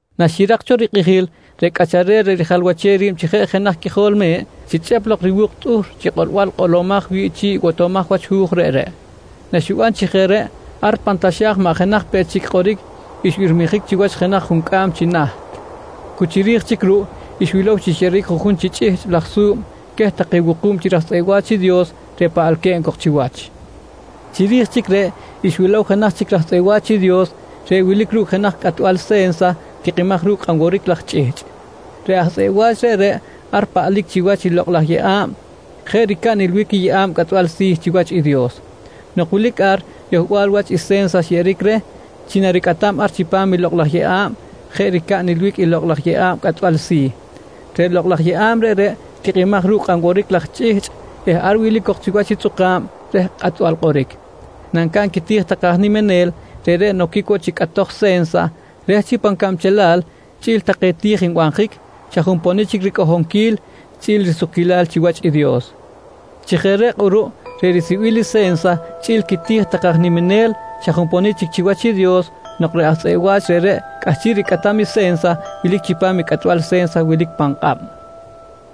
Naxirak cho rikꞌijil, reꞌ Cꞌacharel reꞌ rijalwachem ri̱b chi jeꞌ jenaj Qꞌuijol Me̱ꞌ xichꞌep lok i riwu̱k tꞌuhr chi kꞌolbal kꞌolomaj wi̱ꞌ chi̱ꞌ i botomaj wach hu̱j reꞌreꞌ. Naxiban chi jeꞌ reꞌ, ar pan taxa̱j maꞌ jenaj peꞌ chic kꞌoric xbirmijic chiwach jenaj juncꞌam chi naht. Cu chiri̱j chic ruꞌ xwilow chi xyeꞌeric juꞌjun chi chꞌihchꞌ laj su̱b queh take wuku̱b chi raj tzꞌeꞌ wa̱ch i Dios reꞌ paꞌalque̱b cok chiwach. Chiri̱j chic reꞌ xwilow jenaj chic raj tzꞌeꞌ wa̱ch i Dios reꞌ wilic ru̱cꞌ jenaj cꞌatbal se̱nsa tikꞌimaj ru̱cꞌ kꞌanworic laj chꞌihchꞌ. Reꞌ aj tzꞌeꞌ wa̱ch reꞌreꞌ ar paꞌlic chiwach i lokꞌ laj yeꞌa̱b jeꞌ ricab nilbic i yeꞌa̱b cꞌatbal si̱ chiwach i Dios. Nok wilic ar yohbal wach i se̱nsa xyeꞌeric reh, chi naricꞌatam ar chipam lokꞌ laj yeꞌa̱b jeꞌ ricab nilbic i lokꞌ laj yeꞌa̱b cꞌatbal si̱. Reꞌ lokꞌ laj yeꞌa̱b reꞌreꞌ tikꞌimaj ru̱cꞌ kꞌan woric laj chꞌihchꞌ eh ar wilic cok chiwach i tzꞌuka̱b reh kꞌatbal kꞌoric. Nancaꞌn quiti̱j take aj niminel, reꞌreꞌ noquic woꞌ chi cꞌatoj se̱nsa reh chi pan cabchelal chꞌi̱l take ti̱j nbanjic, xa junponic chic ricꞌohonquil chꞌi̱l risukquilal chiwach i Dios. Chi jeꞌ reꞌ kꞌuruꞌ reꞌ risibil i se̱nsa chꞌi̱l i quiti̱j take aj niminel xa junponic chic chiwach i Dios nok reꞌ aj tzꞌeꞌ wa̱ch reꞌreꞌ cꞌahchiꞌ ricꞌatam i se̱nsa wilic chipam i cꞌatbal se̱nsa wilic pan kꞌab.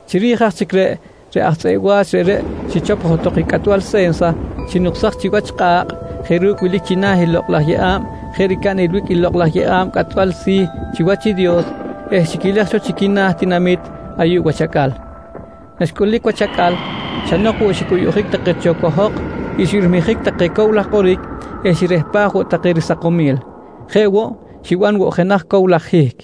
Chiri̱j aj chic reꞌ, reꞌ aj tzꞌeꞌ wa̱ch reꞌreꞌ xichop johtok i cꞌatbal se̱nsa, xinuksaj chiwach kꞌa̱kꞌ jeꞌ ru̱cꞌ wilic china̱ i lokꞌ laj yeꞌa̱b jeꞌ ricab nilbic i lokꞌ laj yeꞌa̱b cꞌatbal si̱ chiwach i Dios eh xiquilej cho chi quina̱ tinamit ayuꞌ wach acꞌal. Naxcꞌulic wach acꞌal, xa nok woꞌ xicꞌuyuꞌjic take cho cohok, xbirmijic take cow laj kꞌoric eh xirehpaj woꞌ take risakomil. Jeꞌ woꞌ, xiban woꞌ jenaj cow laj hihc.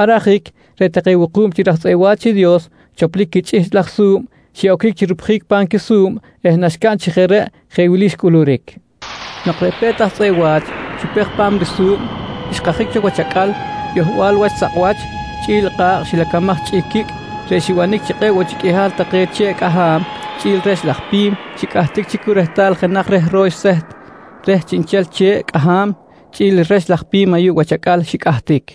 Ar ajic reꞌ take wuku̱b chi raj tzꞌeꞌ wa̱ch i Dios choplic quichꞌihchꞌ laj su̱b xiꞌoquic chi rupjic pa̱m quisu̱b eh naxcaꞌn chi jeꞌ reꞌ, jeꞌ wili xcꞌuluric: Nok reꞌ pe̱t aj tzꞌeꞌ wa̱ch xupej pa̱m risu̱b, xkajic cho wach acꞌal yohbal wach sakꞌwach chꞌi̱l kꞌa̱kꞌ xilacamaj chi quicꞌ reꞌ xibanic chi kꞌe̱ꞌ woꞌ chic qꞌuihal take che̱ꞌ cꞌaham chꞌi̱l rex laj pi̱m xicꞌahtic chi cu rehtal jenaj reh ro̱x seht reh chiꞌnchel che̱ꞌ cꞌaham chꞌi̱l i rex laj pi̱m ayuꞌ wach acꞌal xicꞌahtic.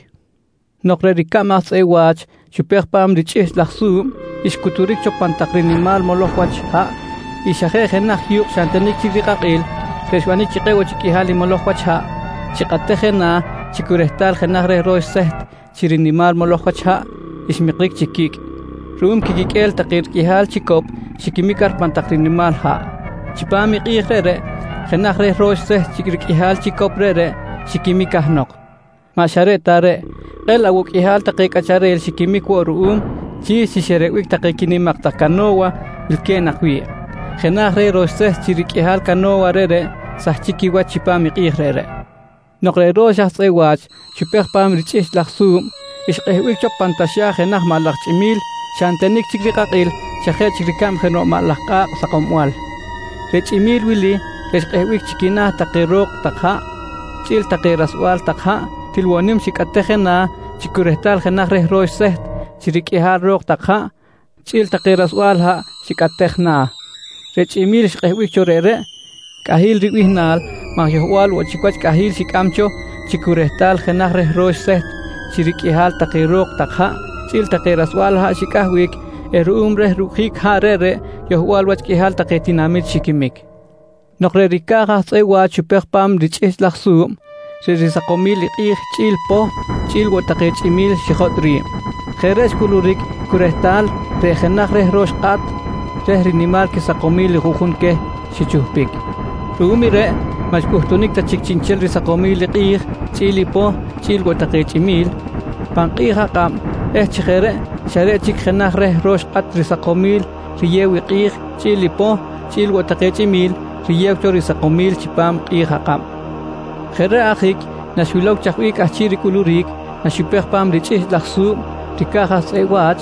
Nok reꞌ ricab aj tzꞌeꞌ wa̱ch xupej pa̱m richꞌihchꞌ laj su̱b, xcuturic cho pan tak rinimal moloj wach haꞌ i xa jeꞌ jenaj yu̱kꞌ xa ntenic chic rikꞌakꞌil reꞌ xbanic chi kꞌe̱ꞌ woꞌ chic qꞌuihal i moloj wach haꞌ xikꞌatej je na̱ chi cu rehtal jenaj reh ro̱x seht chi rinimal moloj wach haꞌ xmikric chi quicꞌ ruꞌum quiquiqꞌue̱l take riqꞌuihal chicop xiquimic ar pan tak rinimal haꞌ. Chipam i kꞌi̱j reꞌreꞌ jenaj reh ro̱x seht chi riqꞌuihal chicop reꞌreꞌ xiquimic cahnok. Maꞌ xa reꞌ ta reꞌ, kꞌe̱ꞌ laꞌ woꞌ qꞌuihal take cꞌacharel xiquimic woꞌ ruꞌum chi xerebic take quinimak tak cano̱wa wilque̱b nak wi̱ꞌ. Jenaj reh ro̱x seht chi riqꞌuihal cano̱wa reꞌreꞌ sahchic quiwach chipam i kꞌi̱j reꞌreꞌ. Nok reꞌ ro̱x aj tzꞌeꞌ wa̱ch xupej pa̱m i richꞌihchꞌ laj su̱b xkꞌehbic cho pan taxa̱j jenaj maꞌ laj chꞌimi̱l xa ntenic chic rikꞌakꞌil xa jeꞌ chic ricab jenoꞌ maꞌ laj kꞌa̱kꞌ sakombal. Reꞌ chꞌimi̱l wili reꞌ xkꞌehbic chi quina̱ take ro̱k tak haꞌ chꞌi̱l take rasbal tak haꞌ, til woꞌ nim xikꞌatej je na̱ chi cu rehtal jenaj reh ro̱x seht chi riqꞌuihal ro̱k tak haꞌ chꞌi̱l take rasbal haꞌ xikꞌatej na̱. Reꞌ chꞌimi̱l xkꞌehbic cho reꞌreꞌ “Cꞌahi̱l” ribihnal maj yohbal woꞌ chic wach cꞌahi̱l xicꞌam cho chi cu rehtal jenaj reh ro̱x seht chi riqꞌuihal take ro̱k tak haꞌ chꞌi̱l take rasbal haꞌ xicꞌahbic eh ruꞌum reh rucꞌjic haꞌ reꞌreꞌ yohbal wach qꞌuihal take tinamit xiquimic. Nok reꞌ ricaj aj tzꞌeꞌ wa̱ch xupej pa̱m richꞌihchꞌ laj su̱b, reꞌ quisakomil i kꞌi̱j chꞌi̱l i poh chꞌi̱l woꞌ take chꞌimi̱l xijotꞌ ri̱b. Jeꞌ reꞌ xcꞌuluric cu rehtal reꞌ jenaj reh ro̱x kꞌat reh rinimal quisakomil i juꞌjun queh xichuhpic. Ruꞌum i reꞌ maꞌ xcꞌuhtunic ta chic chiꞌnchel risakomil i kꞌi̱j chꞌi̱l i poh chꞌi̱l woꞌ take chꞌimi̱l pan kꞌi̱j akꞌab eh chi jeꞌ reꞌ xa reꞌ chic jenaj reh ro̱x kꞌat risakomil riyew i kꞌi̱j chꞌi̱l i poh chꞌi̱l woꞌ take chꞌimi̱l riyew cho risakomil chipam kꞌi̱j akꞌab. Jeꞌ reꞌ ajic naxwilow chaj bih cꞌahchiꞌ ricꞌuluric naxupej pa̱m richꞌihchꞌ laj su̱b i ricaj aj tzꞌeꞌ wach,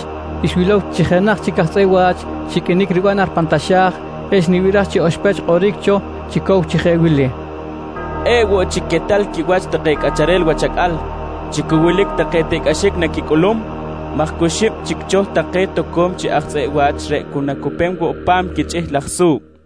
xwilow chi jenaj chic chi aj tzꞌeꞌ wa̱ch xiqꞌuinic riban ar pan taxa̱j eh xnibiraj chi oxpech xkꞌoric cho chi cow chi jeꞌ wili: «Kꞌe̱ꞌ woꞌ chic quetal quiwach take cꞌacharel wach acꞌal chi cu wilic take tiꞌcꞌaxic naquicꞌulum maj cu xib chic cho take toco̱m chi aj tzꞌeꞌ wa̱ch reꞌ cu woꞌ nacupem woꞌ pa̱m i quichꞌihchꞌ laj su̱b, nqui xikꞌor.